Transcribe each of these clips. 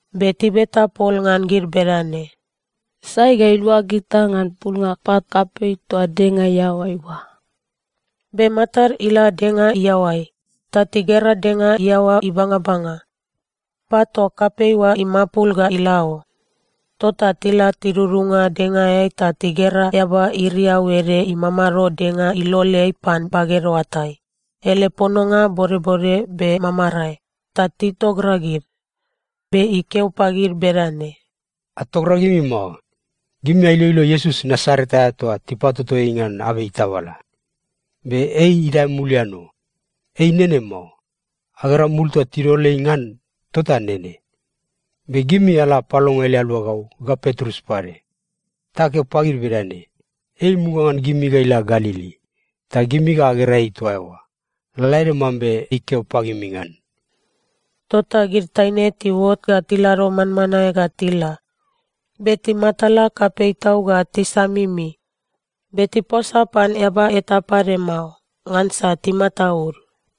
Be tibeta pol ngan gid bedane, “Sai ga ilua gita ngan pulnga pat kapei toa denga iaoai oa?” Be matad ila denga iaoai, ta tigera denga iaoa ibangabanga. Pat toa kapei oa imapul ga ila o. Tota tila tidudunga dengaeai ta tigera eaba iriau ede imamado denga iloleai pan baged oatai. Ele pononga bodbode be mamarae. Ta titogragid. Be ikeo pagid bedane, “Atogragimi mao. Gimi ailoilo Iesus Nasaret aea toa tipatoto ei ngan abei tabala. Be ei idae mulian o! Ei nene mao. Agera mul toa tidol ei ngan tota nene. Be gimi ala apalongo ele aluagau, ga Petrus pade. Ta akeo pagid bedane, ‘Ei imuga ngan gimi ga ila Galili, ta gimi ga agera ei toa eoa, lalaede mambe ikeo pagimi ngan.’” Tota gid taine tiuot ga tilado manmanae ga tila, be timatala kapei tau ga tisamimi. Be tiposa pan eaba eta pade mao, ngansa timataud.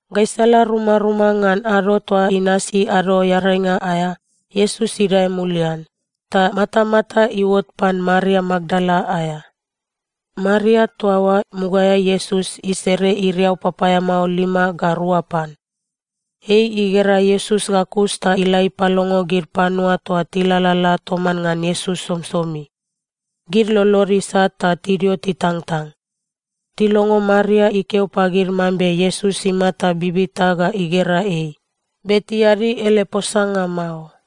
Gaisala rumaruma ngan ado toa inasi Ado Earainga aea, Iesus idae mulian, ta matamata iuot pan Maria Makdala aea. Maria toa oa mugaeai Iesus isere iriau papaeamao lima ga rua pan. Ei igera Iesus ga kus ta ila ipalongo gid panua toa tilalala toman ngan Iesus somisomi. Gid lolod isat ta tidio titangtang. Tilongo Maria ikeo pagid mambe Iesus imata bibita ga igera ei, be tiadi ele posanga mao.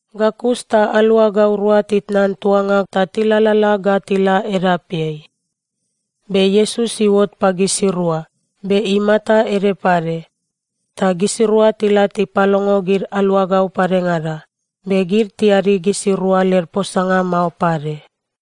Ga kus ta aluagau rua titnan tuanga ta tilalala ga tila edapeai, be Iesus iuot pagisirua, be imata ede pade. Ta gisirua tila tipalongo gid aluagau padengada, be gid tiadi gisirua led posanga mao pade.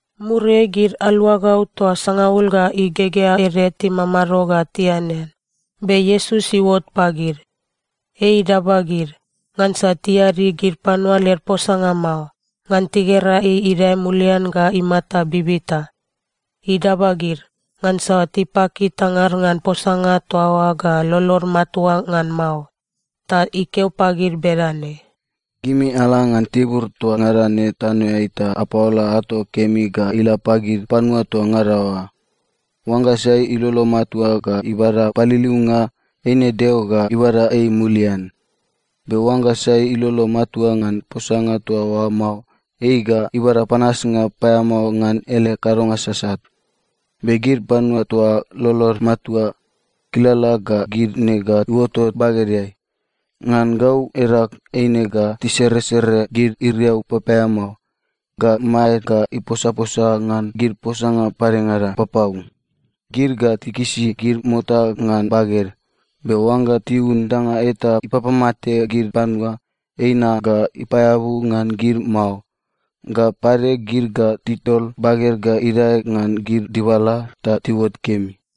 Muriai gid aluagau toa sangaul ga igegea ede timamado ga tianean, be Iesus iuot pagid. Ei idaba gid, ngansa tiadi gid panua led posanga mao, ngan tigera ei idae mulian ga imata bibita. Idaba gid, ngansa tipaki tangad ngan posanga toa oa ga lolod matua ngan mao. Ta ikeo pagid bedane, “Gimi ala ngan tibur toa ngada ne tanoeai ta apaola ato kemi ga ila pagid panua toa ngada oa. Oangga sai ilolo matua ga ibada paliliunga, eine Deo ga ibada ei mulian. Be oangga sai ilolo matua ngan posanga toa oa mao, ei ga ibada panasnga paeamao ngan ele kadonga sasat. Be gid panua toa lolod matua, kilala ga gid ne ga iuotot bagedeai: Ngan gau edag, eine ga tiseresere gid iriau papaeamao, ga maed ga iposaposa ngan gid posanga padengada papau. Gid ga tikisi gid mota ngan baged, be oangga tiun danga eta ipapamate gid panua, eina ga ipaeabu ngan gid mao. Ga pade, gid ga tidol baged ga idae ngan gid dibala, ta tiuot kemi.”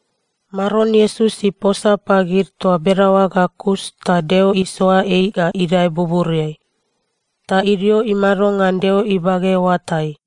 Maron Iesus iposa pagid toa bedaoa ga kus, ta Deo isoa ei ga idae buburiai. Ta idio imado ngan Deo ibage oatai.